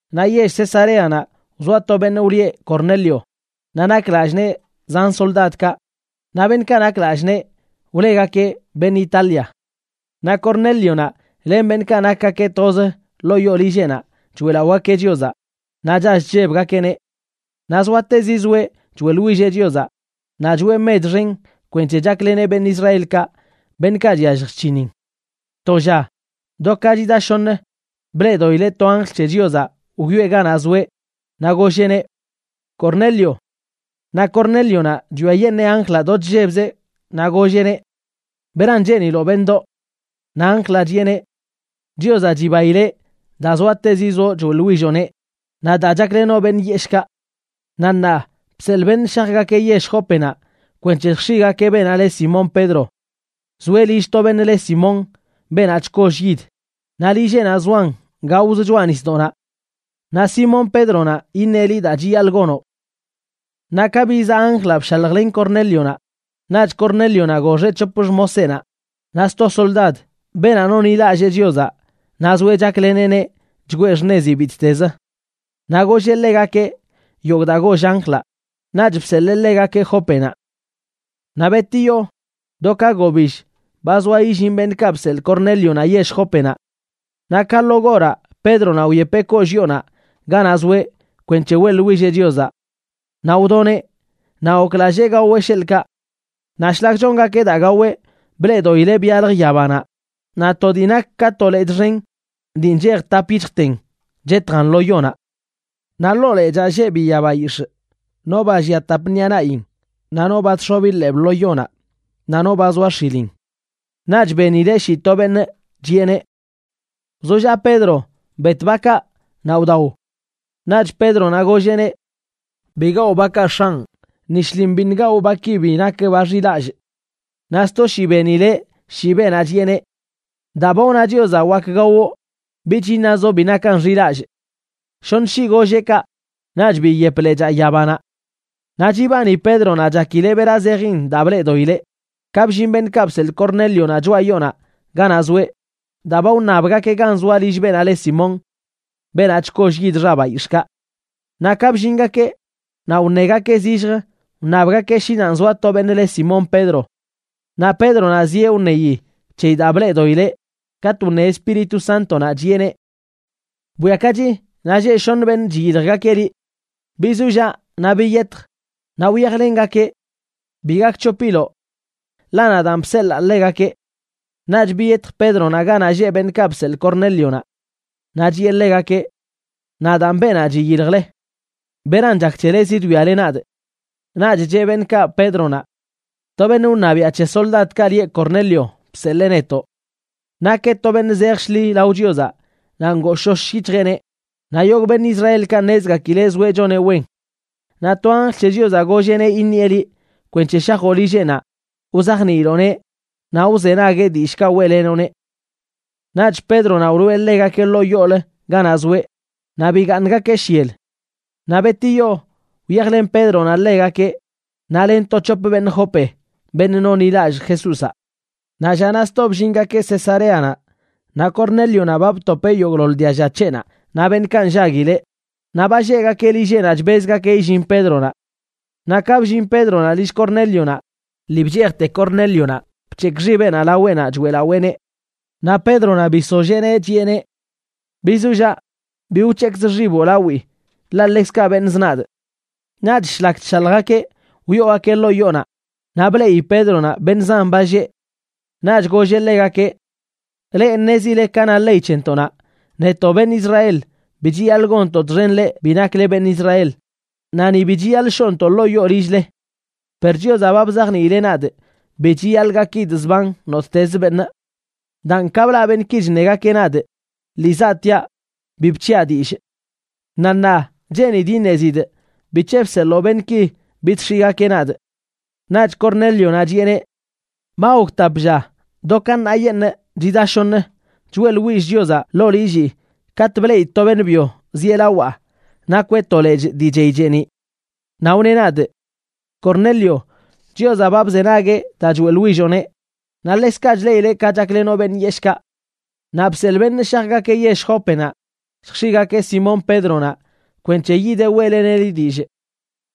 Naꞌ yell Cesareanaꞌ wzoa to beṉꞌ wlieꞌ Cornelio, naꞌ nak lallꞌ nee zan soldadkaꞌ, naꞌ beṉꞌkaꞌ nak lallꞌ nee wlegakeꞌ Beṉꞌ Italia. Naꞌ Cornélionaꞌ len beṉꞌkaꞌ nakgakeꞌ toz ḻoo yoo lilleꞌnaꞌ choeꞌlaꞌogakeꞌ Chiozaꞌ naꞌ chall chllebgakeꞌneꞌ. Naꞌ zoatezi zoeꞌ choeꞌḻwilleꞌ Chiozaꞌ naꞌ choꞌe mech xen kwenc̱he chakleneꞌ beṉꞌ Israelkaꞌ, beṉꞌkaꞌ chyallj chc̱hinin. To lla, do ka chida shoṉ, bleꞌdoꞌileꞌ to anjl c̱he Chiozaꞌ wyoꞌe ganaꞌ zoeꞌ naꞌ golleꞌneꞌ: ―¡Cornelio! Naꞌ Cornélionaꞌ chwiayeṉee anjlaꞌ do chllebzeꞌ, naꞌ golleꞌneꞌ: ―¿Beran cheeniloꞌ beṉꞌdoꞌ? Naꞌ anjlaꞌ chiꞌeneꞌ: ―Chiozaꞌ chibaileꞌ daa zoatezi zoꞌ choeꞌḻwilloꞌneꞌ naꞌ daa chaklenoꞌ beṉꞌ yeshꞌkaꞌ. Naꞌ ṉaa bseḻꞌ beṉꞌ shajgakeꞌ yell Jópenaꞌ kwenc̱he lljx̱iꞌgakeꞌ beenaꞌ le Simón Pedro. Zoeꞌ lill to beṉꞌ le Simón, beenaꞌ chkoll yid, naꞌ lilleꞌnaꞌ zoan gaoz choꞌa nisdoꞌnaꞌ. Naꞌ Simón Pédronaꞌ iṉeꞌ liꞌ daa chiyaḻꞌ gonoꞌ. Naꞌ ka bizaꞌ anjlaꞌ bshaljlen Cornélionaꞌ, naꞌch Cornélionaꞌ goxeꞌ c̱hop xmoseꞌnaꞌ, naꞌ sto soldad, beenaꞌ nonḻilallee Chiozaꞌ naꞌ zoeꞌ chakleneꞌneꞌ chgwee xṉezi bittez. Naꞌ golleꞌ ḻegakeꞌ yogꞌ daa goll anjlaꞌ, naꞌch bseḻee ḻegakeꞌ Jópenaꞌ. Naꞌ betiyo do ka gobill ba zoa illin beṉꞌkaꞌ bseḻꞌ Cornélionaꞌ yell Jópenaꞌ. Naꞌ ka lo goraꞌ, Pédronaꞌ wyepeꞌ kollꞌ yoonaꞌ ganaꞌ zoeꞌ kwenc̱he weꞌḻwilleꞌ Chiozaꞌ. Naꞌ wdoneꞌ, naꞌ goklallee gaweꞌ sheḻꞌkaꞌ. Naꞌ shlak chongakeꞌ daa gaweꞌ, bleꞌdoꞌileꞌ byalj yabanaꞌ, naꞌ to dii nak ka to lechꞌ xen dii nchej tap yic̱hjten chetjan lo yonaꞌ. Naꞌ ḻoo lechaa lleꞌ biya bayix̱ꞌ, no ba llia tap ṉiꞌa naꞌin, naꞌ no ba chx̱obi ḻeeb lo yonaꞌ naꞌ no ba zoa x̱ilin. Naꞌch benileꞌ shii to beṉꞌ, chiꞌeneꞌ: ―Wzollaꞌ Pedro. Bet bakaꞌ, naꞌ wdao. Naꞌch Pédronaꞌ golleꞌneꞌ: ―Bi gawꞌ bakaꞌ, X̱anꞌ; ni shlin biṉꞌ gawꞌ baki bi nak ba xilallꞌ. Naꞌ sto shii benileꞌ shii beenaꞌ, chiꞌeneꞌ: ―Daa ba wna Chiozaꞌ wak gawoꞌ, bich iṉazoꞌ bi nakan xilallꞌ. Shoṉ shii golleꞌ kaꞌ, naꞌch biyep lechaa yabanaꞌ. Naꞌ chibani Pédronaꞌ chakileꞌ bera zejin daa bleꞌdoꞌileꞌ, ka bllin beṉꞌkaꞌ bseḻꞌ Cornélionaꞌ choꞌa yoonaꞌ ganaꞌ zoeꞌ, daa ba wṉabgakeꞌ gan zoa lill beenaꞌ leꞌ Simón, beenaꞌ chkollꞌ yid xa bayix̱ꞌkaꞌ. Naꞌ ka bllingakeꞌ, naꞌ wṉegakeꞌ zillj wṉabgakeꞌ shi nanꞌ zoa to beṉꞌ le Simón Pedro. Naꞌ Pédronaꞌ zieꞌ wṉeyi c̱heyi daa bleꞌdoꞌileꞌ, katꞌ wne Espíritu Sántonaꞌ, chiꞌeneꞌ: ―Bwiakachi, naꞌ lleꞌ shoṉ beṉꞌ chiyiljgakeꞌ liꞌ. Bizollaꞌ naꞌ biyetj, naꞌ wyajlengakeꞌ. Bi gakc̱hopiloꞌ, ḻaꞌ nadaan bseḻaa ḻegakeꞌ. Naꞌch biyetj Pédronaꞌ ganaꞌ lleꞌ beṉꞌkaꞌ bseḻꞌ Cornélionaꞌ. Naꞌ chiꞌe ḻegakeꞌ: ―Nadaan beenaꞌ chiyiljle. ¿Beran chak c̱hele zidwiale nadꞌ? Naꞌch cheꞌ beṉꞌkaꞌ Pédronaꞌ: ―To beṉꞌ wṉabiaꞌ c̱he soldadkaꞌ lieꞌ Cornelio bseḻee netoꞌ. Nakeꞌ to beṉꞌ zej shḻi lao Chiozaꞌ naꞌ ngooshosh yic̱hjeꞌneꞌ, naꞌ yogꞌ beṉꞌ Israelkaꞌ ṉezgakileꞌ zoeꞌ choneꞌ wen. Naꞌ to anjl c̱he Chiozaꞌ golleꞌneꞌ iṉieꞌ liꞌ kwenc̱he shajoꞌ lilleꞌnaꞌ wzajniiloꞌneꞌ naꞌ wzenagueꞌ dillꞌkaꞌ weꞌlenoꞌneꞌ. Naꞌch Pédronaꞌ wloꞌe ḻegakeꞌ ḻoo yoolə ganaꞌ zoeꞌ, naꞌ bigaaṉgakeꞌ shyel. Naꞌ betiyo wyajlen Pédronaꞌ ḻegakeꞌ naꞌ len to c̱hop beṉꞌ Jope, beṉꞌ nonḻilallꞌ Jesúzaꞌ. Naꞌ llanaꞌ sto bllingakeꞌ Cesareanaꞌ. Naꞌ Cornélionaꞌ ba btopeꞌ yogꞌḻoḻ dialla c̱heꞌnaꞌ naꞌ beṉꞌkaꞌ nllaguileꞌ, naꞌ ba lleꞌgakeꞌ lilleꞌnaꞌ chbezgakeꞌ illin Pédronaꞌ. Naꞌ ka bllin Pédronaꞌ lill Cornélionaꞌ, lii bchejte Cornélionaꞌ bc̱hekꞌ xibeꞌnaꞌ laweꞌnaꞌ choeꞌlaweeneꞌ. Naꞌ Pédronaꞌ bisolléeneꞌ, chiꞌeneꞌ: ―Bizollaꞌ, bi wc̱hekzꞌ xiboꞌ lawii, ḻaꞌ ḻekzkaꞌ beṉꞌzə nadꞌ. Naꞌch shlak chshaljgakeꞌ wyoogakeꞌ ḻoo yoonaꞌ, naꞌ bleꞌi Pédronaꞌ beṉꞌ zan ba lleꞌ. Naꞌch golleꞌ ḻegakeꞌ: ―Leꞌ ṉezile ka na ley c̱hentoꞌnaꞌ, netoꞌ beṉꞌ Israel bi chiyaḻꞌ gonntoꞌ txen leꞌ bi nakle beṉꞌ Israel, naꞌ ni bi chiyaḻꞌ shoꞌntoꞌ ḻoo yoo lill-le. Per Chiozaꞌ ba bzajniileꞌ nadꞌ bi chiyaḻꞌ gakidꞌ zban nottez beṉꞌ. Daan ka blaꞌ beṉꞌki chṉegakeꞌ nadꞌ, lii zaꞌtiaꞌ bi bc̱hiaꞌ dillꞌ. Naꞌ ṉaa cheenidꞌ iṉezidꞌ bic̱he bseḻoo beṉꞌki bidx̱iꞌgakeꞌ nadꞌ. Naꞌch Cornélionaꞌ chiꞌeneꞌ: ―Ba gok tap lla, do ka ṉaayeṉꞌ, chida shoṉ, choeꞌḻwillꞌ Chiozaꞌ ḻoo lillii katꞌ bleꞌidꞌ to beṉꞌ byo zieꞌ lawaꞌ nakweꞌ to lechꞌ dii chey cheeniꞌ. Naꞌ wneꞌ nadꞌ: “Cornelio, Chiozaꞌ ba bzenagueꞌ daa choeꞌḻwilloꞌneꞌ, naꞌ ḻekzkaꞌ chleꞌileꞌ ka chaklenoꞌ beṉꞌ yeshꞌkaꞌ. Naꞌ bseḻꞌ beṉꞌ shajgakeꞌ yell Jópenaꞌ lljx̱iꞌgakeꞌ Simón Pédronaꞌ kwenc̱he yideꞌ weꞌleneꞌ liꞌ dillꞌ.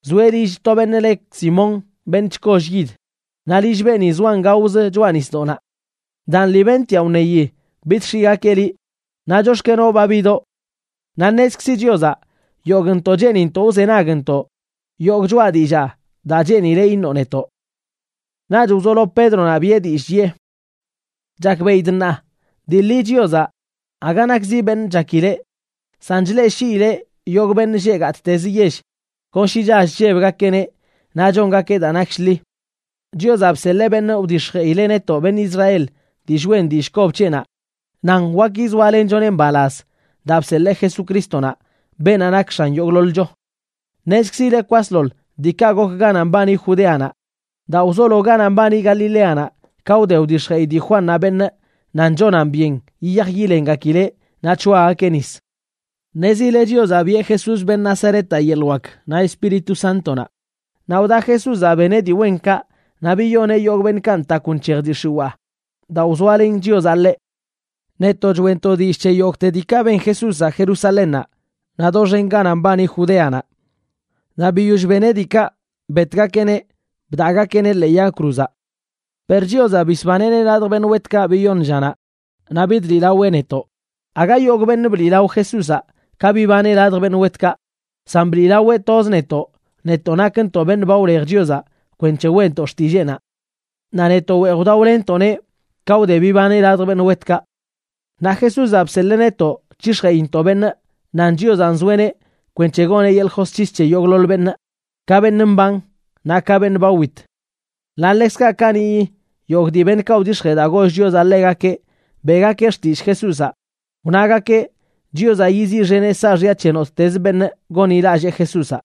Zoeꞌ lill to beṉꞌ le Simón, beṉꞌ chkoll yid, naꞌ lill beeni zoan gaoz choꞌa nisdoꞌnaꞌ.” Daan lii bentiaꞌ wṉeyi bidx̱iꞌgakeꞌ liꞌ, naꞌ chox̱kenoꞌ ba bidoꞌ. Naꞌ ṉezkzi Chiozaꞌ yogꞌntoꞌ cheenintoꞌ wzenagntoꞌ yogꞌ choꞌa dillaa daa cheenileꞌ iṉoꞌ netoꞌ. Naꞌch wzolo Pédronaꞌ biꞌe dillꞌ, chiꞌe: ―Chakbeꞌidꞌ ṉaa, dii ḻi Chiozaꞌ aga nakzi beṉꞌ chakileꞌ, san chleꞌshiileꞌ yogꞌ beṉꞌ lleꞌ gattez yell kon shi chall chllebgakeꞌneꞌ naꞌ chongakeꞌ daa nak shḻi. Chiozaꞌ bseḻee beṉꞌ wdix̱jeꞌileꞌ netoꞌ beṉꞌ Israel dillꞌ wen dillꞌ kob c̱heꞌnaꞌ nan wak yizoalenchoneꞌ mbalaz daa bseḻee Jesucrístonaꞌ, beenaꞌ nak X̱an yogꞌḻoḻcho. Ṉezkzile kwasḻoḻ diikaꞌ gok ganaꞌ mbani Judeanaꞌ, daa wzolo ganaꞌ mbani Galileanaꞌ ka wde wdix̱jeꞌi dii Juannaꞌ beṉꞌ nan chonan byen yiyaj yilengakileꞌ naꞌ c̱hoagakeꞌ nis. Ṉezile Chiozaꞌ biꞌe Jesús, beṉꞌ Nazaretaꞌ, yeḻꞌ wak naꞌ Espíritu Sántonaꞌ, naꞌ wda Jesúzaꞌ beneꞌ dii wenkaꞌ naꞌ biyoneꞌ yogꞌ beṉꞌkaꞌ ntakw nc̱hej dii x̱iwaa, daa wzoalen Chiozaꞌ ḻeꞌ. Netoꞌ choeꞌntoꞌ dillꞌ c̱he yogꞌte diikaꞌ ben Jesúzaꞌ Jerusalénnaꞌ naꞌ doxen ganaꞌ mbani Judeanaꞌ. Naꞌ biyoll beneꞌ diikaꞌ, betgakeꞌneꞌ bdaꞌgakeꞌneꞌ ḻee yag cruzaꞌ. Per Chiozaꞌ bisbaneꞌneꞌ ladj beṉꞌ wetkaꞌ biyoṉ llanaꞌ, naꞌ bidliꞌlaweꞌ netoꞌ. Aga yogꞌ beṉꞌ bliꞌlao Jesúzaꞌ ka bibaneꞌ ladj beṉꞌ wetkaꞌ, san bliꞌlaweꞌ toz netoꞌ, netoꞌ nakntoꞌ beṉꞌ ba wlej Chiozaꞌ kwenc̱he weꞌntoꞌ xtilleenaꞌ. Naꞌ netoꞌ weej wdaolenntoꞌneꞌ ka wde bibaneꞌ ladj beṉꞌ wetkaꞌ. Naꞌ Jesúzaꞌ bseḻee netoꞌ c̱hix̱jeꞌintoꞌ beṉꞌ nan Chiozaꞌ nzoeꞌneꞌ kwenc̱he goneꞌ yeḻꞌ josc̱his c̱he yogꞌḻoḻ beṉꞌ, ka beṉꞌ mban naꞌ ka beṉꞌ ba wit. Naꞌ ḻekzkaꞌ kaniꞌyi yogꞌ dii beṉꞌkaꞌ wdix̱jee daa goll Chiozaꞌ ḻegakeꞌ beꞌgakeꞌ xtillꞌ Jesúzaꞌ, wnagakeꞌ Chiozaꞌ yiziꞌxeneꞌ saaxya c̱he nottezə beṉꞌ gonḻilallee Jesúzaꞌ.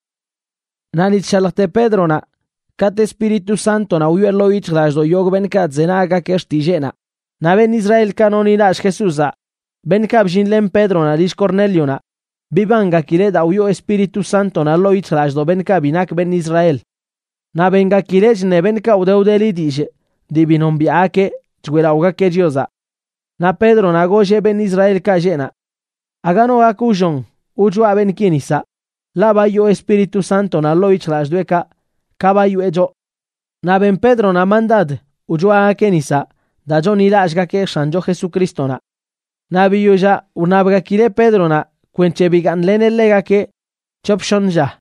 Naꞌ ni chshaljte Pédronaꞌ, katꞌ Espíritu Sántonaꞌ wyoꞌe ḻoo yic̱hjlallꞌdoꞌ yogꞌ beṉꞌkaꞌ chzenaggakeꞌ xtilleenaꞌ. Naꞌ beṉꞌ Israelkaꞌ nonḻilallꞌ Jesúzaꞌ, beṉꞌkaꞌ bllinlen Pédronaꞌ lill Cornélionaꞌ, bibangakileꞌ daa wyoo Espíritu Sántonaꞌ ḻoo yic̱hjlallꞌdoꞌ beṉꞌkaꞌ bi nak beṉꞌ Israel. Naꞌ bengakileꞌ chṉe beṉꞌkaꞌ wde wdeli dillꞌ dii bi nombiaꞌgakeꞌ, choeꞌlaꞌogakeꞌ Chiozaꞌ. Naꞌ Pédronaꞌ golleꞌ beṉꞌ Israelkaꞌ lleꞌ naꞌ: ―Aga no gak wllon wchoa beṉꞌki nisaꞌ, ḻaꞌ ba yoo Espíritu Sántonaꞌ ḻoo yic̱hjlallꞌdoꞌekaꞌ ka ba yoꞌe choꞌ. Naꞌ ben Pédronaꞌ mandad wchoagakeꞌ nisaꞌ daa chonḻilallꞌgakeꞌ X̱ancho Jesucrístonaꞌ. Naꞌ biyollaꞌ wṉabgakileꞌ Pédronaꞌ kwenc̱he bigaaṉleneꞌ ḻegakeꞌ c̱hop shoṉ lla.